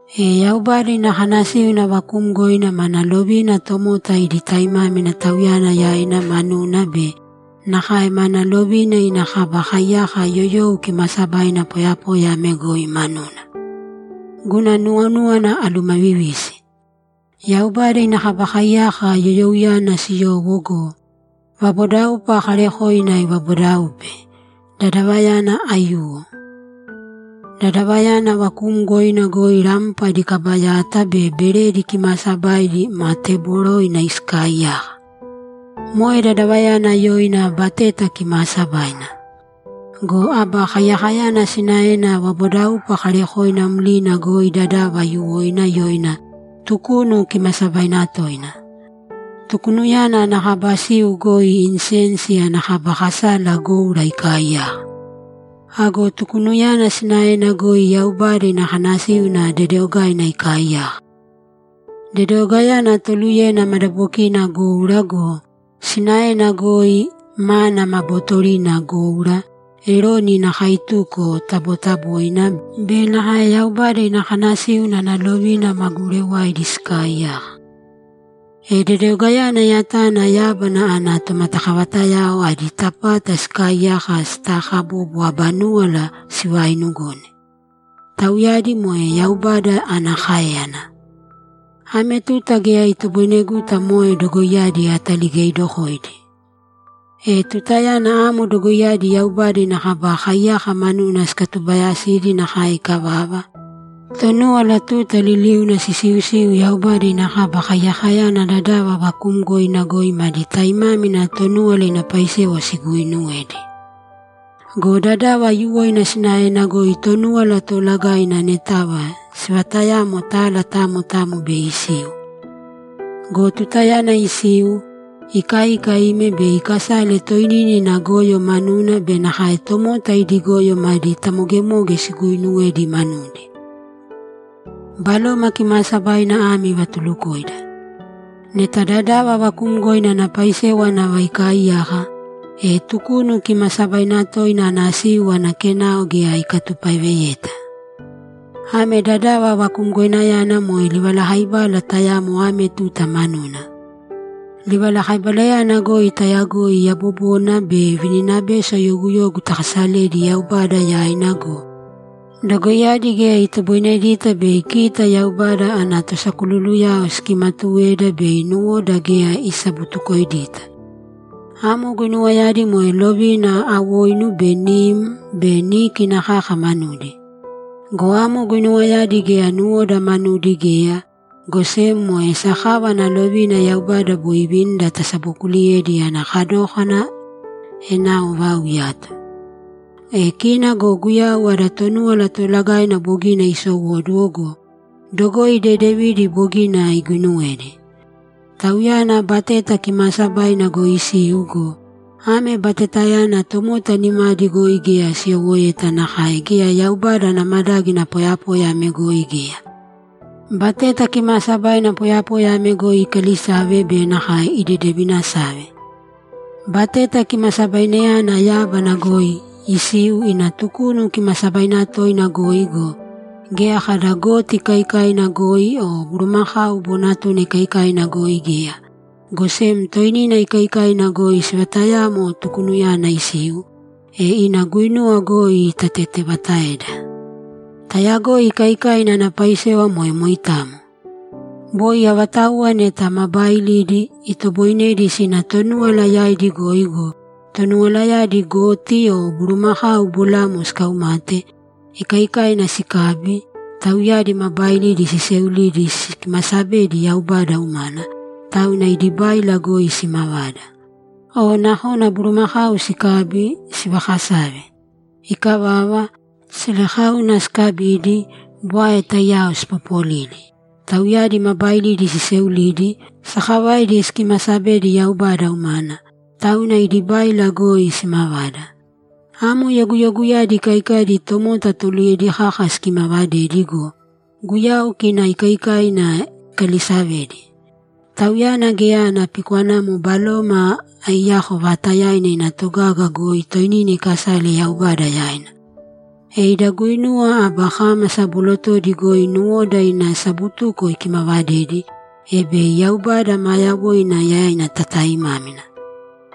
E Yaubada ina kanasíuna vakuumgoina mana lovina tomota idi taimámina Tauyana yaina manuna be nakae mana lovina ina Kaba Kaiyaka yoyou kimaasabaina poyapoya ame goi manuna. Guna nuwonúwana alumavivisi. Yaubada ina Kaba Kaiyaka yoyouyana siyowo go, vabodaupa kaarekoina ivabodaupe, dadava aiyuwo. Dadavayana vakuumgoina goi rampa adi kaba yata be beredi kimaasabaidi ma teboroina sikaaiyaka. Moe dadavayana yoina Bateta Kimaasabaina. Go Aba Kaiyakayana sinaena vabodaupa kaarekoina mlina goi dadava aiyuwoina yoina Tukunu Kimaasabaina Toina. Tukunuyana ana kaba siu goi insensi ana kaba kasala goura ikaaiyaka. Ago Tukunuyana sinaena goi Yaubada ina kanasíuna dedeogaina ikaaiyaka. Dedeogainayana toluyena madabokina goura go, sinaena goi mana ma botorina goura, Eroni ina kaituko tabotaboina, be nakae Yaubada ina kanasíuna ana lovina ma gurewaidi sikaaiyaka. E dedeogayana yatana yábana ana tomatakavatayao adi tapata sikaaiyaka sitaakabobo aba núwala sivainugone; tauyadi moe Yaubada ana káeyana. Ame tuta geya itoboineguta moe dogoiyadi ataligeidokoidi. E tutayana amo dogoiyadi Yaubada ina Kaba Kaiyaka manuna sikatubayasidi nakae ikavava, Tonúwala tuta liliuna sisiusiu Yaubada ina Kaba Kaiyakayana dadava vakuumgoina goi madi taimámina Tonúwala ina paisewa siguuinuwedi. Go dadava aiyuwoina sinaena goi Tonúwala Toolagaina anetava sivatayamo tala tamo tamo bei isiu. Go tutayana isiu, ikaika ime bei ikasale toinina ina goyo manuna be nakae tomota idi goyo madi tamogemoge siguuinuwedi manudi. Baloma Kimaasabaina ame ivatulukoida: Neta dadava vakuumgoina ana paisewa nava ikaaiyaka, e Tukunu Kimaasabaina Toina ana siu ana kenao geya ikatupaeveta. Ame dadava vakumgoinayana moe livalakaibala tayamo ame tuta manuna. Livalakaibalayana goi tayagoi yabobona be vininabeso yoguyogu takasaledi Yaubada yaina go, dogoiyadi geya itoboinedita bei kita Yaubada ana tosakululuyao sikimatuweda bei nuwoda geya isabutukoidita. Amo guinuwayadi moe lovina awoinu be nim be níkina kaka manudi. Go amo guinuwayadi geya nuwoda manudi geya, go sem moe sakava ana lovina Yaubada boi ivinida tasabokuuliyedi ana kadókana enao vau iyato. E kina go Guyau ada Tonúwala Toolagaina bogina isowóduwo go, dogoi dedevidi bogina iguinuwedi. Tauyana Bateta Kimaasabaina goi isiu go, ame Batetayana tomota nimadi goi geya siyowoeta nakae geya Yaubada ana madágina poyapoya ame goi geya. Bateta Kimaasabaina poyapoya ame goi ikalisave be nakae idedevinasave. Bateta Kimasabainayana yábana goi isiu ina Tukunu Kimaasabaina Toina goi go, geya kada goti ikaikaina goi o bulumakau bonatuna ikaikaina goi geya, go sem toinina ikaikaina goi sivatayamo Tukunuyana isiu, e ina guinuwa goi itatetevataeda. Tayagoi ikaikaina ana paisewa moe moitamo. Boi avatauwa neta ma baailidi, itoboinedi sina Tonúwala yaidi goi go, Tonuwalayadi goti o bulumakau bolamo sikaumate, ikaikaina sikabi, tauyadi ma baailidi siseulidi sikimasabedi Yaubada umana, tauna idi báila goi simavada. O nakona bulumakau sikabi, sivakasave. Ikavava, selekauna sikabidi, bwae taiyao sipopolidi, tauyadi ma baailidi siseulidi, sakavaidi sikimasabedi Yaubada umana, tauna idi báila goi simavada. Amo yoguyoguyadi ikaikaidi tomota toluyedi kaka sikimavadedi go, Guyau kina ikaikaina ikalisavedi. Tauyana geya ana pikwanamo Baloma aiyako vaatayaina ina togaga goi toinina ikasale Yaubada yaina. E ida guinuwa aba kámasa bolotodi goi nuwoda ina sabutuko ikimavadedi, e bei Yaubada maa yawoina yaina tataaimámina.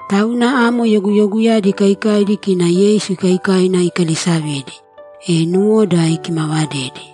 Tauna amo yoguyoguyadi ikaikaidi kina Yeisu ikaikaina ikalisavedi, e nuwoda ikimavadedi.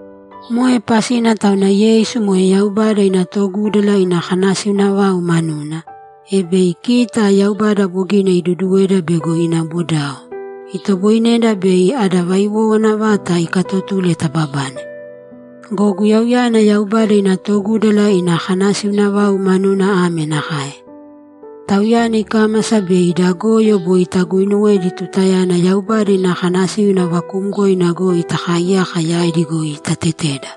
Moe pasina tauna Yeisu moe Yaubada ina togúdala ina kanasiuna vau manuna, e bei kita, Yaubada bogina iduuduweda bego ina bodao, itoboineda bei ada vaiwowana vata ikaatotule tababane. Go Guyauyana Yaubada ina togúdala ina kanasiuna vau manuna ame nakae: Tauyana ikámasa bei ida goyo boi taguuinuwedi tutayana Yaubada ina kanasíuna vakuumgoina goi takaaiyaka yaidi goi itateteda.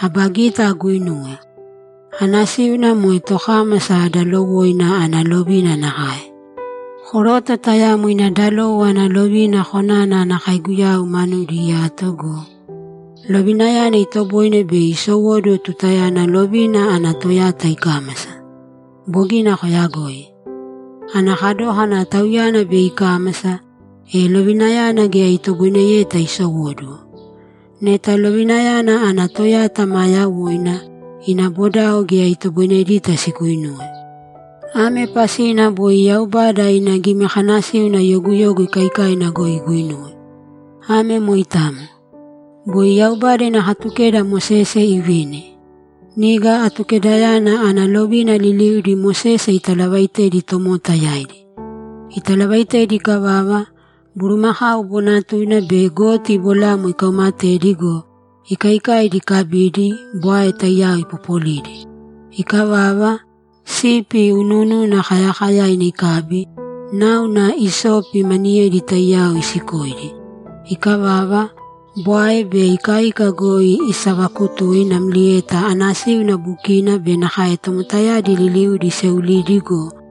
Aba gita aguinuwe. Anasíuna moe tokámasa dalowoina ana lovina nakae. Koroto tayamo ina dalowo ana lovina konana ana kaiguyau manudi iyato go, lovinayana itoboine bei isowóduwo tutayana lovina ana toyata ikámasa. Bogina koyagoi. Ana kadókana tauyana bei ikámasa, e lovinayana geya itoboineyeta isowóduwo. Neta lovinayana ana toyata maa yawoina, ina bodao geya itoboinedita siguinuwe. Ame pasina boi Yaubada ina gimikanasíuna yoguyogu ikaikaina goi iguinuwe. Ame moitamo. Boi Yaubada ina Katukeda Mosese ivini. Niga Atukedayana ana lovina liliudi Mosese italavaitedi tomota yaidi. Italavaitedi ikavava, bulumakau bonatuna be goti bolamo ikaumatedi go, ikaikaidi ikabidi, bwae taiyao ipopolidi. Ikavava, sipi unuununa kayakayaina ikabi, náuna isopi maniyedi taiyao isikoidi. Ikavava, bwae be ikaika goi isavakutui namlieta anasíuna bukina be nakae tomotayadi liliudi iseulidi go,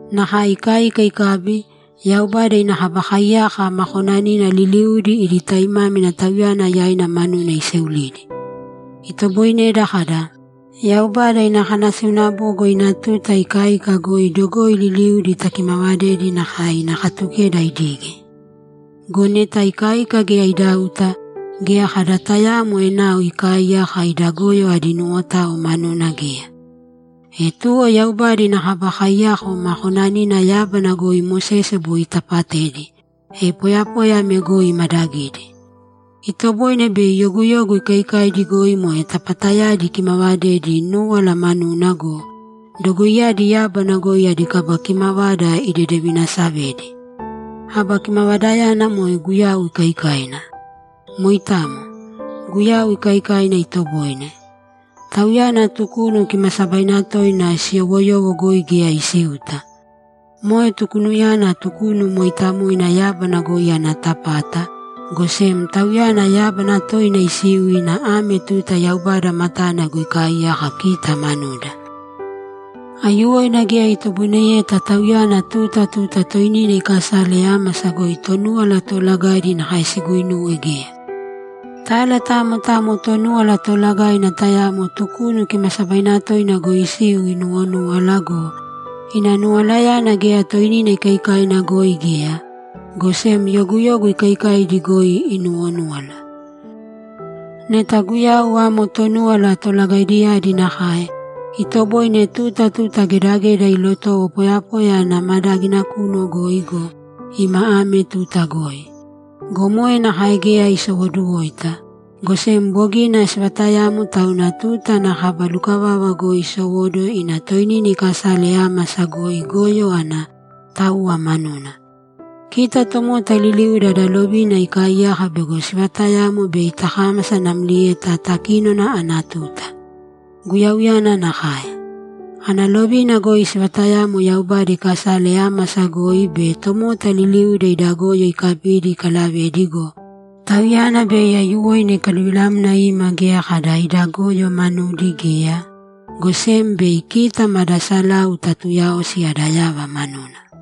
Nakae ikaika ikabi, Yaubada ina Kaba Kaiyaka ma konanina liliudi idi taimámina Tauyana yaina manuna iseulidi. Itoboineda kada, ‘Yaubada ina kanasiuna bogo ina tuta ikaika goi dogoi liliudi takimavadedi nakae ina Katukeda idige.’ Go neta ikaika geya idauta, geya kada tayaamo enao ikaaiyaka ida goyo adi nuwotao manuna geya. E tuwo Yaubada ina Kaba Kaiyaka ma konanina yábana goi Mosese boi itapatedi, e poyapoya ame goi imadagidi. Itoboine bei yoguyogu ikaikaidi goi moe tapatayadi ikimavadedi núwala manuna go, dogoiyadi yábana goi adi kaba kimavada idedevinasavedi; aba kimavadayana moe Guyau ikaikaina. Moitamo. Guyau ikaikaina itoboine. Tauyana Tukunu Kimaasabaina toina siyowoyowo goi geya isiuta. Moe Tukunuyana Tukunu mooitamoina yábana goi ana tapata, go sem Tauyana yábana toina isiu ina ame tuta Yaubada matana goi ikaaiyaka kita manuda. Aiyuwoina geya itoboineyeta Tauyana tuta tuta toinina iikasale ámasa goi Tonúwala Toolagaidi nakae siguinuwe geya. Tala tamo tamo Tonúwala Toolagaina tayamo Tukunu Kimaasabaina Toina goi isiu inuwonúwala go, ina nuwalayana geya toinina ikaikaina goi geya, go sem yoguyogu ikaikaidi goi inuwonúwala. Neta Guyau amo Tonúwala Tolagaidiyadi nakae, itoboine tuta tuta gedageda ilotowo poyapoya ana madágina kunu goi go, ima ame tuta goi. Go moe nakae geya isowoduwoita, go sem bogina sivatayamo tauna tuta ana kaba lukavava goi isowóduwo ina toinina ikasale ámasa goi goyo ana táuwa manuna. Kita tomota liliuda ada lovina ikaaiyaka bego sivatayamo bei takámasa namlieta takínona ana tuta. Guyauyana nakae. Ana lovina goi sivatayamo Yaubada ikasale ámasa goi be tomota liliuda ida goyo ikabidi ikalavedi go, Tauyana bei aiyuwoina ikaluvilamna ima geya kada ida goyo manudi geya, go sem bei kita mada salau tatuuyaosi ada yava manuna.